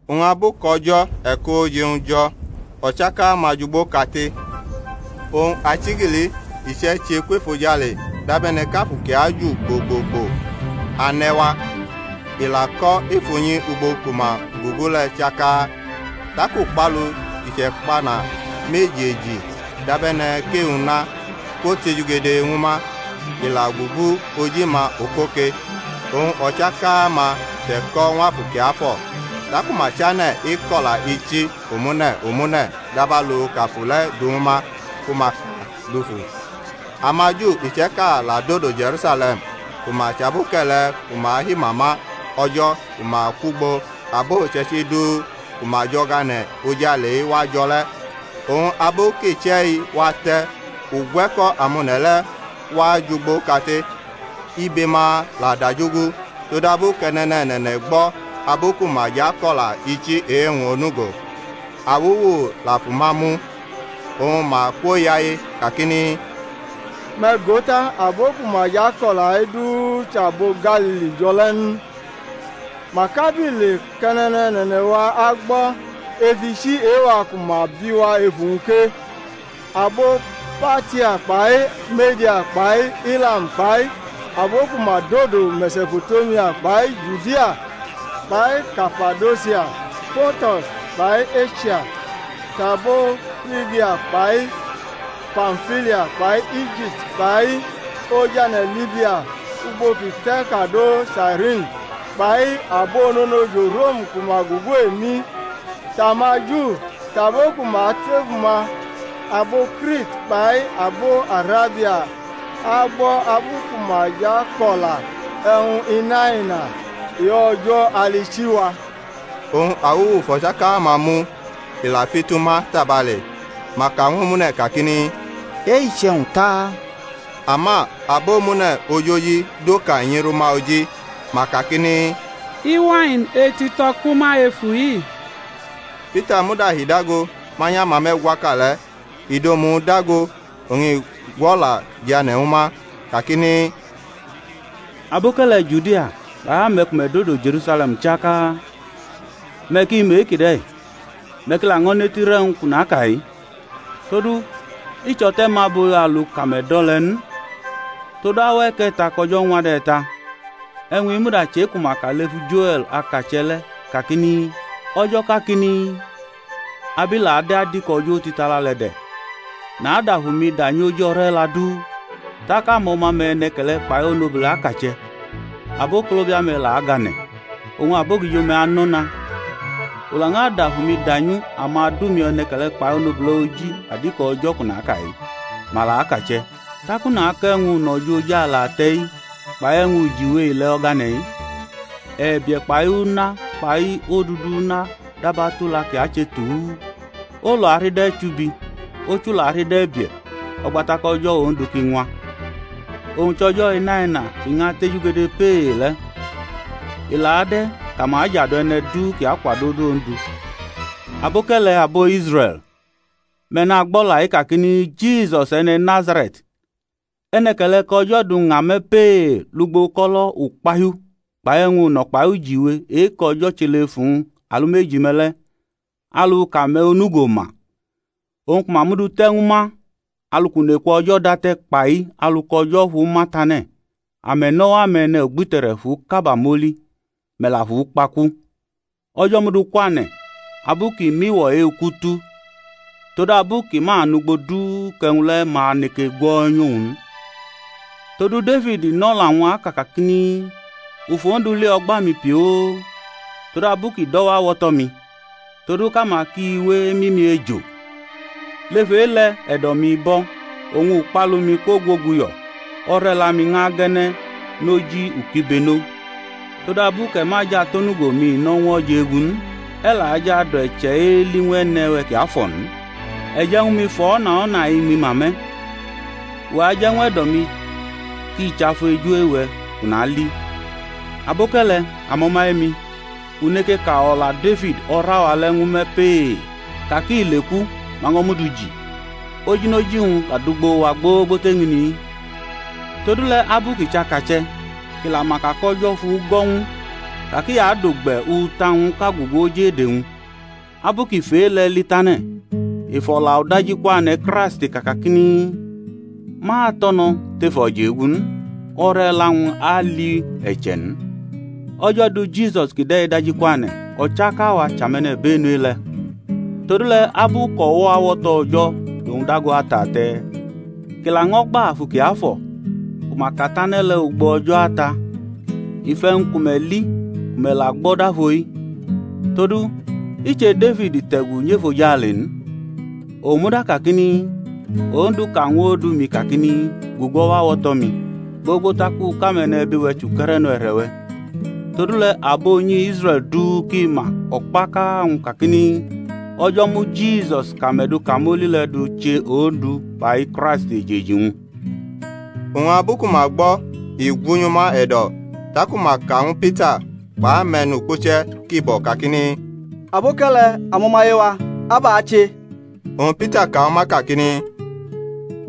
Oñ abu kʼo̩jo̩ e̩kʼooje-wñ jo̩ o̩chaka-ma jʼugbo kate. Oñ achigili iche̩ che kwef ojale dabe̩ne̩ kʼafu ki aju gbo gbo gbo ane̩ wa. I la ko̩ ef unyi ugbo ku ma gugu le̩ chaka. Tak ukpalu ki chʼe̩kpana meji eji, dabe̩ne̩ kʼe-una, kwotejugede ñwu ma. I la kwogugu oji-ma okoke. Oñ o̩chn-ka-ma che̩ko̩ ñw Afu Kiafo̩, taku ma chane̩ eko̩la ichi omune̩ omune̩ dabalu kʼAfu le̩ du ñwu ma ku ma ka dufu. AmaJu iche̩ka la dodo Je̩rusale̩m ku ma chʼaboke̩le̩ ku ma himama O̩jo̩ ku ma kwʼugbo abo uche̩ichi du ku ma jʼo̩gane̩ ojale-i wa jo̩ le̩. Oñ abu kʼiche̩-i wate̩ ugwe̩ko̩ amone̩ le̩ wa jʼugbo kate. Ibe-ma la dajugu todabu kʼe̩ne̩ne̩ne̩ne̩ gbo̩ abu ku ma jʼako̩la ichi e-wñ onugo. Awuwu la fu ma mu, oñ ma kwoyaye kakini, Me̩ go ta, abo ku ma jʼako̩la-i du chʼabo Galili jo̩ le̩ n? Mak abile kʼe̩ne̩ne̩ne̩ne̩-wa agbo̩ ef ichi e-wa ku ma bi wa efu-wñ ke? Abo Partia kpai Me̩dia kpai Ilam kpai abo ku ma dodo Me̩sopo̩temia, kpai Judia, kpai Kapadosia, Ponto̩s kpai Esia. Tʼabo Frigia kpai Pamfilia, kpai Ijipti kpai ojane̩ Libia ugbo ki te̩ kado Sairini, kpai abononojo Rom ku ma gugu emi, tʼamaJu tʼabo ku ma tefu-ma, abo Krit kpai abo Arabia, a agbo̩ abu ku ma jʼako̩la e̩wñ inaina e-O̩jo̩ alichi-wa. Oñ awuwu fʼo̩chaka-ma mu, i la fitu ma tabale. Ma ka ñw omune̩ kakini, E-i chʼe̩wñ ta? Ama abomune̩ ojoji dokanyi rʼuma oji, ma kakini, Iwain etito̩ kʼuma efu-i. Pita muda hi dago manyʼamame̩gwaka le̩, i dʼomu-wñ dago oñ i gwʼo̩la jane̩ ñwu ma kakini, Aboke̩le̩ Judia kpai ame̩ ku me̩ dodo Je̩rusale̩m chaka, me̩ ki mʼe-kide̩, me̩ ki laño̩ netirʼe̩wñ kʼu naka-i. Todu i chʼo̩te̩ mu abo̩-i alu kʼame̩ do̩ le̩ n, todu auwa e̩ke̩ta kʼo̩jo̩ ñwa de̩ ta. E̩wñ-i muda chʼe-ku ma ka lefu Joe̩l akache̩ le̩ kakini, O̩jo̩ kakini, Ab i la ade̩ adiko o̩jo̩ otitala le̩ de̩, nadʼAfu-mi danyʼoji o̩re̩la du, tak amo̩ma-me̩ e̩ne̩ke̩le̩ kpai onobule̩ akache̩, abokolobia-me̩ la agʼane̩, oñ abogijo-me̩ anʼo̩na; u lañʼadʼAfu-mi danyu amadu-mi e̩ne̩ke̩le̩ kpai onobule̩ oji adiko o̩jo̩ kʼu naka-i; ma la akache̩. Tak u nakʼe̩wñ uno̩ jo̩ ojale ate̩-i, kpai e̩wñ ujiwe ile̩ o̩gane̩-i: e̩bie̩ kpai una kpai odudʼuna dab atula ki ache tuu. Olu arida e̩chubi, ochu la arida e̩bie̩, o̩gba tak o̩jo̩ Ondu ki ñwa. Owñ chʼo̩jo̩ inaina kʼi ñʼatejugede pee le̩. I la ade̩ kʼama ajadu e̩ne̩ du kʼi akwado̩ odu Ondu. Aboke̩le̩, abo Israe̩l, me̩ nagbʼo̩la-i kakini, Jisus e̩ne̩ Nazare̩t, e̩ne̩ke̩le̩ kʼO̩jo̩ du ña me̩ pee lugbo uko̩lo̩ ukpahiu kpai e̩wñ uno̩ kpai ujiwe e-kʼO̩jo̩ che lef uwñ alumeji-me̩ le̩, alu kʼame̩ onugo ma; owñ, ku ma mudu te̩ ñwu ma alu kʼuneku O̩jo̩ date̩, kpai alu kʼO̩jo̩ fuma tane̩, ame̩ nʼo̩wo̩ ame̩nugbite̩re̩ fʼu kaba mʼoli, me̩ la fʼu kpa ku: O̩jo̩ mʼu du kwane̩, abu kʼi mʼiwo̩ e-uku tu, todabu ki ma nʼugbo du kʼe̩wñ le̩ ma neke gwo̩nyʼowñ n. Todu Defid nʼo̩la-wñ aka kakini, U fʼOndu li o̩gba-mi pioo; todabu kʼi dʼo̩wo̩ awo̩to̩-mi, todu kʼama ki we emi umi ejo. Lef e-le̩ e̩do̩-mi bo̩, oñ ukpalu-mi kwogwoguyo̩; o̩re̩la-mi ñʼage̩ne̩ noji ukibeno; todabu kʼe̩ ma jʼatʼonugo-mi no̩ ñw o̩jegu n, e̩ la jʼadu e̩che̩ eli ñw E̩ne̩-we̩ kiafo̩ n. E̩ je̩ ñw mi fʼo̩na o̩na iñmi ma me̩; uwe̩ aje̩ ñw e̩do̩-mi ki chafu eju-we̩ kʼu nali. Aboke̩le̩, amo̩maye-mi, u neke ka o̩la Defid, o̩ra-wa le̩ ñw me̩ pee, ka kʼi leku, ma ño̩ mʼu du ji, ojinoji-wñ la dʼugbo wa gbogbo tʼeñini-i. Todule̩, abu kʼi chʼakache̩, kʼi la ma ka kʼO̩jo̩ fugo̩ ñw u ka kʼi adʼugbe̩ uta-wñʼka gugu oj ede-wñ: abu kʼi fʼe-le̩ li tane̩, i fʼo̩la udajikwane̩ Kraisti ka kakini, Ma tʼo̩ no̩ tʼef o̩jegu n, o̩re̩la-wñ la li e̩che̩ n. O̩jo̩ du Jisusi kide̩ dajikwane̩, o̩chaka-wa chʼame̩nibenu e-le̩. Todule̩ abu kʼo̩wo̩ awo̩to̩ O̩jo̩ dʼowñ dago atate̩, kʼi laño̩ gba Afu Kiafo̩ ku ma katane̩ le̩ ugbo O̩jo̩ Ata, i fʼe̩wñ ku me̩ li ku me̩ la gbo̩ dafo-i. Todu i che Defid te̩gu nyʼefojale n, owñ muda kakini, Ondu ka ñw Ondu-mi kakini, Gugu o̩wo̩ awo̩to̩-mi, gbogbo tak u kʼame̩nebi-we̩ chʼuke̩re̩no e̩re̩-we̩. Todule̩ abo unyi Israe̩l du ki ma o̩kpaka-wñ kakini, O̩jo̩ mu Jisus kʼame̩ du kamoli le̩ du che Ondu kpai Kraist, ejeji-wñ. Oñ abu ku ma gbo i gwunyʼuma e̩do̩, taku ma ka ñw Pita kpʼame̩nukpuche̩ kibo̩ kakini, Aboke̩le̩, amo̩maye-wa, abʼa ache? Oñ Pita ka ñw ma kakini,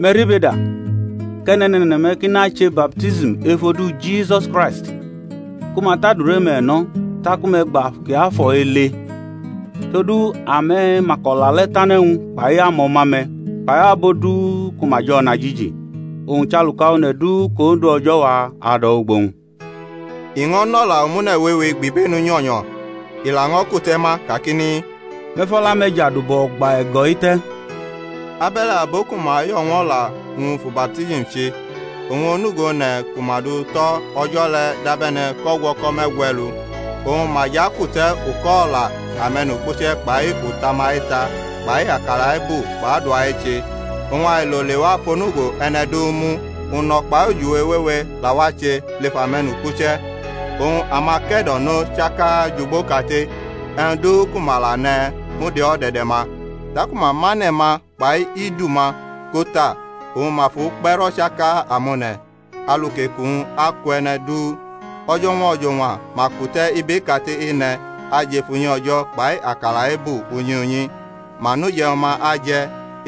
Me̩ ribeda, kʼe̩ne̩ne̩ne̩ne̩-me̩ ki nache baptism ef odu Jisusi Kraisti, ku ma tʼadure-me̩ no̩ taku me̩ agbʼAfu Kiafo̩ ele. Todu ame̩ ma kʼo̩la le̩ tane̩ ñwu, kpai amo̩ma-me̩ kpai abo du ku ma jʼo̩najiji, owñ chʼaluka one̩ du kʼOndu O̩jo̩-wa ado̩wʼugbo-wñ. I ño̩ nʼo̩la omune̩ wewe gbʼibenu nyo̩nyo̩, i laño̩ kute̩ ma kakini, Me̩ fʼo̩la-me̩ jadu bʼo̩gba e̩go̩-i te̩. Abe̩le̩ abo ku ma yo̩ ñw o̩la-wñ fu baptism che: oñ onugo one̩ ku ma du tʼo̩ o̩jo̩ le̩ dabe̩ne̩ kʼo̩gwo̩ko̩ me̩gwe̩lu. Oñ ma jʼakute̩ uko̩-o̩la ame̩nukpuche̩ kpai uta-ma eta kpai akala ebu kpai adua eche. Oñ ailo lewa fʼonugo e̩ne̩ du mu: uno̩ kpai ujiwe wewe la wache lef ame̩nukpuche. Oñ amake̩do̩no chaka jʼugbo kate, e̩wñ du ku ma la ne̩ mud e-o̩de̩de̩-ma; taku ma mʼane̩-ma kpai idu-ma ko ta, oñ ma fʼu kpe̩rʼo̩chaka amone̩, alu kʼeku-wñ aku e̩ne̩ du. O̩jo̩ñwa o̩jo̩ñwa ma kute̩ ibe kate ene̩ ajʼef unyi O̩jo̩ kpai akala ebu unyi unyi, ma nʼuje̩wñ-ma aje̩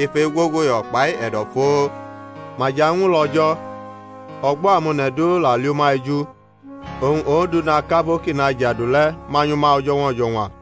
ef egwoguyo̩ kpai e̩do̩ foo, ma jʼañwulo̩ O̩jo̩, o̩gbo̩ amone̩ du la li uma eju. Oñ Ondu na kʼabo kʼi nʼajadu le̩ manyʼuma o̩jo̩ñwa o̩jo̩ñwa.